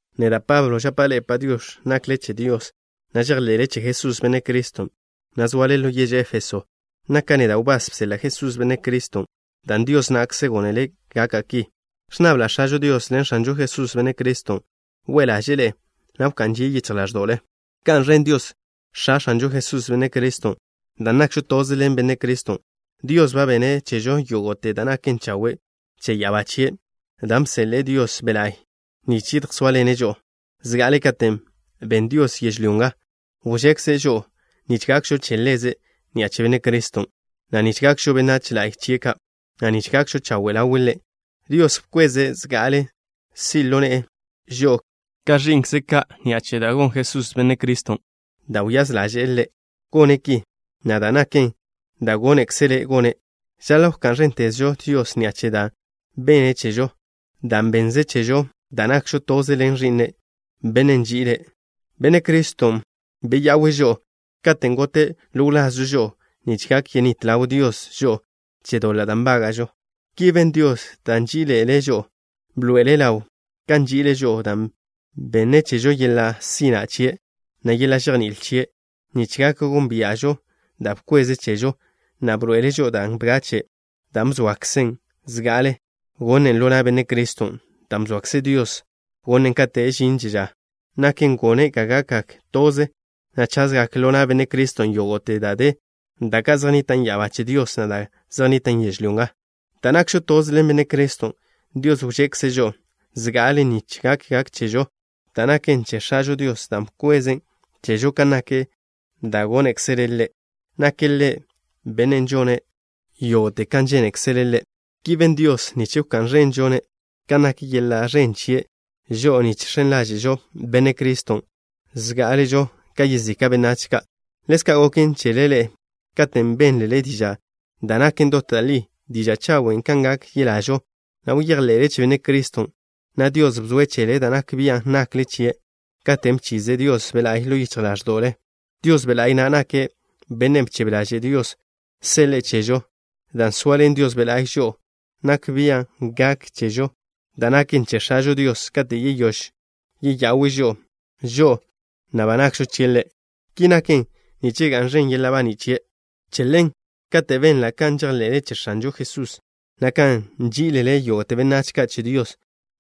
Neda', Pablo, žapa' ḻe'e “Padiox̱”, nakle che Dios, na' žejḻe'le che Jesús, Benne' Criston', na' zoale ḻo yež Éfeso. Naka' neda' wbás bseḻa' Jesús, Benne' Criston', dan' Dios na'kze gónele' gaka' ki. Ẕnnabla' X̱ažo Dios ḻen X̱anžo Jesús, Benne' Criston', we' ḻaže'e ḻe'e, na' wká'n žie' yichj ḻáẕdo'le. ¡Ga'n ẕen Dios, X̱a X̱anžo Jesús, Benne' Criston'! Dan' nakžo toze ḻen Benne' Criston', Dios ba benne' chežo yógo'te da' naken chawe' che ya'abá chie', dan' bseḻe'e Dios Be' La'y nich yedjsóaḻene' žo'o. Zga'ale kate' ben Dios yežlyó nga, wžekze' žo'o nich gakžo che Ḻeze' ni'a che Benne' Criston', na' nich gakžo benách la'y chie' ka', na' nich gakžo chawe' ḻawe' Ḻe'. Dios bkweze' zga'ale si' ḻo ne'e žo'o ka ẕi'nkze' ka' ni'a che da' gon Jesús, Benne' Criston', dan' wyáz ḻaže'e Ḻe' gone' ki, na' dan' naken da' gónekzele' gone'. Žaḻa' wká'n ẕéntezžo Dios ni'a che da' benne' chežo, dan' bennze' chežo dan' nakžo toze ḻen Ẕi'ne', Bennen' nži'ile'. Benne' Criston' beya'we' žo'o katen' gote' ḻo wlazžo žo'o nich gak yenít ḻaw Dios žo'o che doḻa' da' nbága'žo. Ki ben Dios dan' nží'iḻe'ele' žo'o. Bḻoe'ele' ḻaw kan nži'ile' žo'o dan' benne' chežo yeḻa' sina' chie', na' yeḻa' žejní'il chie' nich gak gónbia'žo da' bkweze' chežo, na' bḻoe'ele' žo'o da' bgache', dan' bzoakzen' zga'ale gonen' ḻo na' Benne' Criston'. Dan' bzoakze Dios gonen' kate' žinte ža, naken gone' ga gakgak toze, na' chazgak ḻo na' Benne' Criston' yógo'te da' de, da' ka' zej nnitan' ya'abá che Dios, na' da' ka' zej nnitan' yežlyó nga. Dan' nakžo toze ḻen Benne' Criston', Dios wžekze' žo'o zga'ale nich gak chežo da' naken che X̱ažo Dios, dan' bkwezen' chežo kan nak da' gónekzele' Ḻe'. Nake' Ḻe' Bennen' žone' yógo'te kan žénekzele' Ḻe'. Ki ben Dios nich wká'n ẕenžo-ne' kan nak yeḻa' ẕen chie', žo'o ni žx̱en ḻáže'žo Benne' Criston' zgá'aležo ka yezika' benách ka'. Ḻezka' goken chele ḻe'e. Katen' bénlele diža' da' naken dot da' li, diža' chawen' kan gak yelažo, na' bejḻe'le che Benne' Criston', na' Dios bzoe' chele da' nak bian' nakle chie', katen' bchize' Dios Be' La'y ḻo yichj ḻáẕdo'le. Dios Be' La'y na' nake' Bennen' bchebe ḻaže' Dios seḻe'e chežo. Dan' zoaḻen Dios Be' La'y žo'o, nak bia' gak chežo da' naken che X̱ažo Dios kate' yeyóž yeya'we' žo'o, žo'o na' ba nakžo chie' Ḻe'. Ki naken nich ga'n ẕen yeḻa' baní' chie'. Che ḻen, katen' benla' kan žejḻe'le che X̱anžo Jesusen', na' kan nží'ilele yógo'te benách ka' che Dios,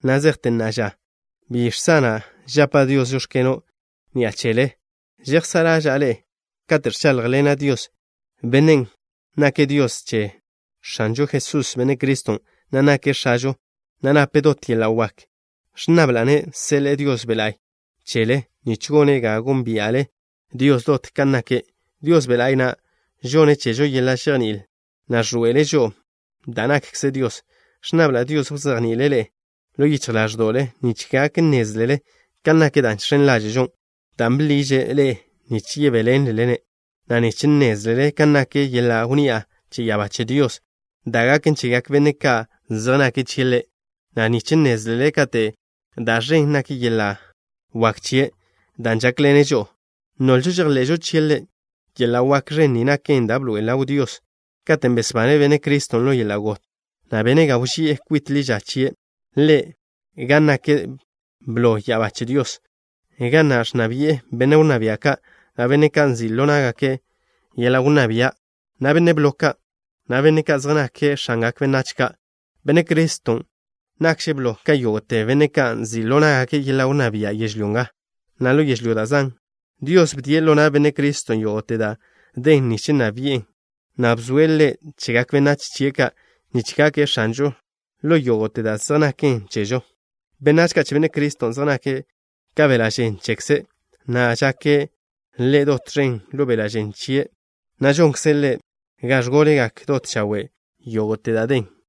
na' zejte na'a ža bi žsana' žapa' Dios: “Žóx̱keno'” ni'a chele. Žejsá' ḻaža'a ḻe'e kate' ẕcháḻjḻena' Dios, Bennen' nake' Dios che X̱anžo Jesús, Benne' Criston', na' nake' X̱ažo, na' nape' dot yeḻa' wak. Ẕnnabla'-ne' seḻe'e Dios Be' La'y chele, nich gone' ga gónbia'le Dios dot kan nake'. Dios Be' La'y na' žonne' chežo yeḻa' žejní'il, na' ẕḻoe'ele' žo'o da' nakkze Dios. Ẕnnabla' Dios wzejni'ile' ḻe'e ḻo yichj ḻáẕdo'le nich gak nnézlele kan nak da' žx̱en ḻáže'žo, dan' bḻiže' ḻe'e nich yebéḻenlelen, na' nich nnézlele kan nak yeḻa' wnni'a che ya'abá che Dios da' gaken chegak benne' ka' zej nake' chie' Ḻe', na' nich nnézlele kato da' ẕen nak yeḻa' wak chie', dan' žákḻenen žo'o, nolžo žejḻe'žo chie' Ḻe'. Yeḻa' wak ẕen ni naken da' bḻoe'el ḻaw Dios katen' besbane' Benne' Criston' ḻo yeḻa' got, na' bene' ga wži'e kwit ḻi ža chie' Ḻe' gan nake' blo ya'abá che Dios, ga na' ẕnna bi'e benne' wnná bia' ka', na' benne' ka' nzi' ḻo ná'gake' yeḻa' wnná bia', na' benne' blo ka', na' benne' ka' zej nake' x̱angak benách ka'. Benne' Criston' nakže' blo ka yógo'te benne' ka' nzi' ḻo ná'gake' yeḻa' wnná bia' yežlyó nga, na' ḻo yežlyó da' zan'. Dios bdie' ḻo na' Benne' Criston' yógo'te da' den nich nna bi'en, na' bzoe' Ḻe' chegak benách chie' ka' nich gake' X̱anžo ḻo yógo'te da' zej naken chežo. Benách ka' che Benne' Criston' zej nake' ka beḻa' žen chekze', na' žake' Ḻe' dot ẕen ḻo beḻa' žen chie' na'. Žonkze' Ḻe' ga ẕgólegak dot chawe' yógo'te da' den.